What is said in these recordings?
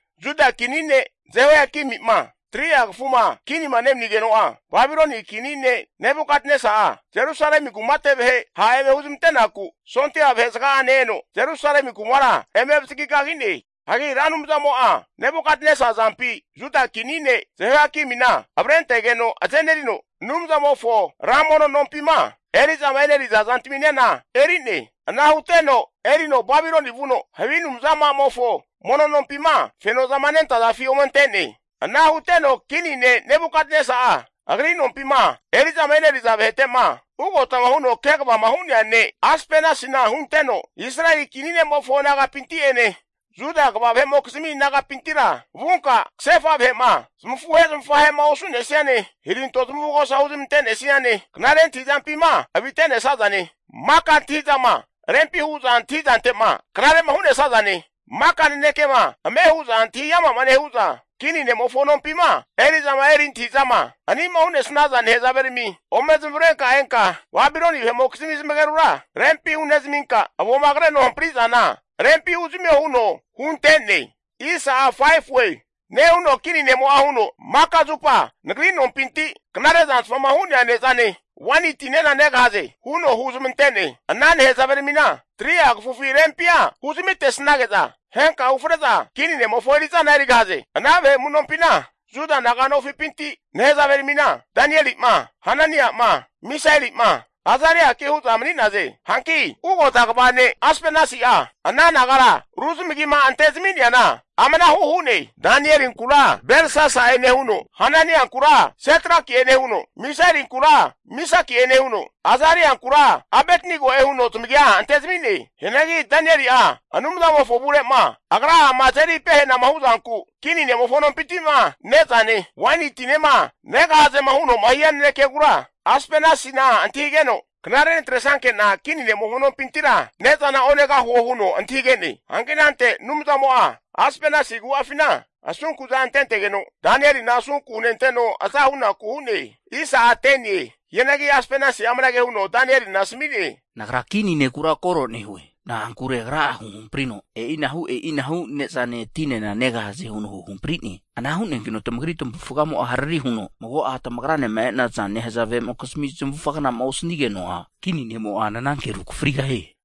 Juda kini ne' Jehoiakimi'ma 3'a kafuma kinima nemanigeno'a, Babiloni kini ne' Nebukatnesa'a Jerusalemi kumate vahe ha' eme huzmante'naku sondia vahe zaga'ane eno Jerusalemi kumara eme avazagi kagi'ne. Hagi Ra Anumzamo'a Nebukatnesa azampi Juda kini ne' Jehoiakimina avrentegeno azenerino, Anumzamofo ra mono nompima eri'zama eneriza zantaminena eri'ne. Ana huteno erino Babiloni vuno, havi anumza'amofo mono nompima fenozama nentazafi omente'ne. Ana huteno kini ne' Nebukatnesa'a, agri nompima eri'zama eneriza vahete'ma ugotama huno kegavama hu'nea ne' Aspenasina hunteno, Israeli kini ne'mofo nagapinti'ene Juda kva vahe'mokizmi nagapintira, vunka kasefa vahe'ma zamafuhe zamafahe'ma osu'nesiane, hiranto zamavugosa huzmante'nesiane knare antahi'zampima avite'nesazane, maka antahintahi'zama rempi hu'za antahi'zantema knare hu'nesazane, maka nanekema ame hu'za antahiama'ma nehu'za, kini ne'mofo nompima eri'zama eri antahi'zama ani'ma hu'nesnaza nahezaverami, ome zamavarenka enka Babiloni vahe'mokizmi zamagerura rempi hunezaminka, avoma kreno hampri'zana rempi huzamio huno hunte'ne. Nehuno kini nemo'a huno, Maka zupa nagri nompinti knare zantfama hu'nea ne'zane waini tinena negahaze huno huzmante'ne. Ana nahezaveramina 3'a kafufi rempia huzamitesnage'za, henka ufre'za kini ne'mofo eri'zana erigahaze. Ana vahe amunompina, Juda naga'nofipinti nehazaveramina, Danieli'ma, Hanania'ma, Misaeli'ma, Azariaki hu'za mani'naze. Hanki ugota kva ne' Aspenesa'a ana nagara ru zamagima ante zami'neana amanahu hu'ne. Danielinkura Belsasa'e nehuno, Hananiankura Setraki'e nehuno, Misaelinkura Misaki'e nehuno, Azariankura Abetnego'e huno zamagia antezami'ne. Hianagi Danieli'a Anumzamofo avure'ma agra'ama azeri pehenama hu'zanku, kini ne'mofo nompinti'ma ne'zane waini tinema negahazema huno'ma hia nanekegura Aspenasina antahigeno, knare natresankena kini ne'mofo nompintira ne'zana onegahuo huno antahige'ne. Hanki anante Anumzamo'a Aspenasi agu'afina asunku'za antentegeno, Danielina asunku hunenteno aza hunaku hu'ne. Hianagi Aspenasi'a amanage huno Danielina asami'ne. Nagra kini nekura koro nehue. Na'ankure agra'a huhamprino e'inahu e'inahu ne'zane tinena negahaze huno huhampri'ne. Ana hu'neankino tamagri tamavufgamo'a hariri huno, mago'a tamagranema e'naza nehazavemokizmi zamavufaga gna'ma osanigeno'a, kini ne'mo'a nananke rukafrigahie.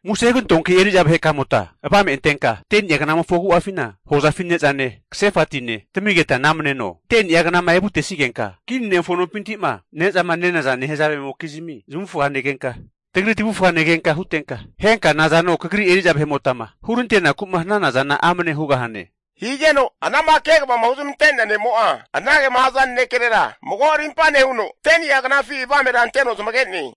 Muse hugantoanki eri'za vahekamota avame antenka, 10ni'a knamofo agu'afina, hozafi ne'zane, kasefa tine tamigeta namneno. Hagi 10ni'a knama evutesigenka, kini ne'mofo nompinti'ma ne'zama nenaza nehazavemokizmi zamavufaga negenka, tagri tavufga negenka hutenka, henka nazano kagri eri'za vahe'motama hurante'naku'ma hanana zana amne hugahane. Higeno anama kegavama huzmante'nea ne'mo'a anagema haza nanekerera mago arimpa nehuno, 10ni'a knafi avamera anteno zamage'ne.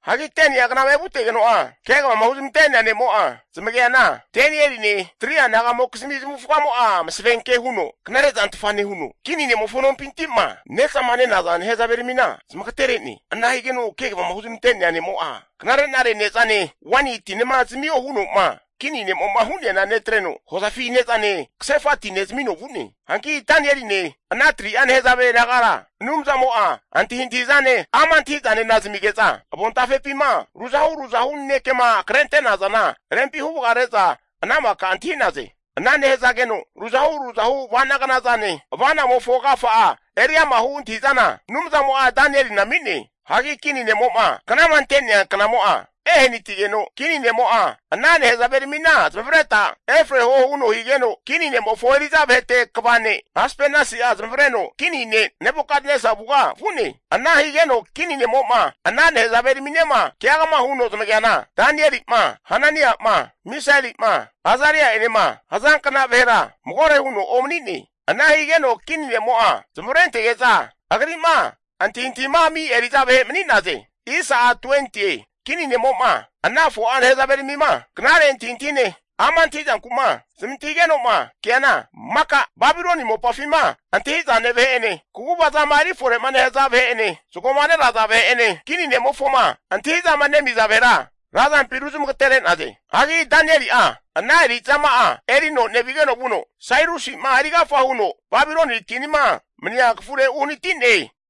Hagi 10ni'a knama evutegeno'a, kegavama huzmante'nea ne'mo'a zamageana, Danieline 3'a nagamokizmi zamavufagamo'a masavenke huno knare zantfa nehuno, kini ne'mofo nompinti'ma ne'zama nenaza nehazaveramina zamagatere'ne. Ana higeno kegavama huzmante'nea ne'mo'a, knare'nare ne'zane waini tinema zamio huno'ma kini ne'mo'ma hu'neana netreno, hozafi ne'zane kasefa tine zamino vu'ne. Hanki Danieline ana 3'a nehazave nagara Anumzamo'a antahintahi'zane ama' antahi'zanena zamige'za, avontafepima ruzahu ruzahu nanekema krente'nazana rempi huvagare'za ana maka antahi'naze. Ana nehazageno ruzahu ruzahu avanagna zane, ava'namofo agafa'a eriama hu antahi'zana Anumzamo'a Danielina ami'ne. Hagi kini ne'mo'ma knama ante'nea knamo'a ehanatigeno, kini nemo'a ana nehazaveramina zamavareta efreho huno higeno, kini ne'mofo eri'za vahete kva ne' Aspenasi'a zamavareno kini ne' Nebukatnesa avuga vu'ne. Ana higeno kini ne'mo'ma ana nehazaveraminema keagama huno zamageana, Danieli'ma, Hanania'ma, Misaeli'ma Azari'enema hazankna vahera magore huno omanine. Ana higeno kini ne'mo'a zamavarentege'za agri'ma antahintahima ami' eri'za vahe mani'naze. Kini ne'mo'ma ana 4'a nehazaveramima, knare antahintahine, ama' antahi'zanku'ma zamantahigeno'ma keana, maka Babiloni mopafima antahi'zane vahe'ene, kagu'vazama erifore'ma nehaza vahe'ene, zagoma neraza vahe'ene kini ne'mofoma antahi'zama nemiza vahera razampi ruzmagatere'naze. Hagi Danieli'a ana eri'zama'a erino nevigeno vuno, Sairusi'ma erigafa huno Babiloni kinima mania kafure uhanati'ne.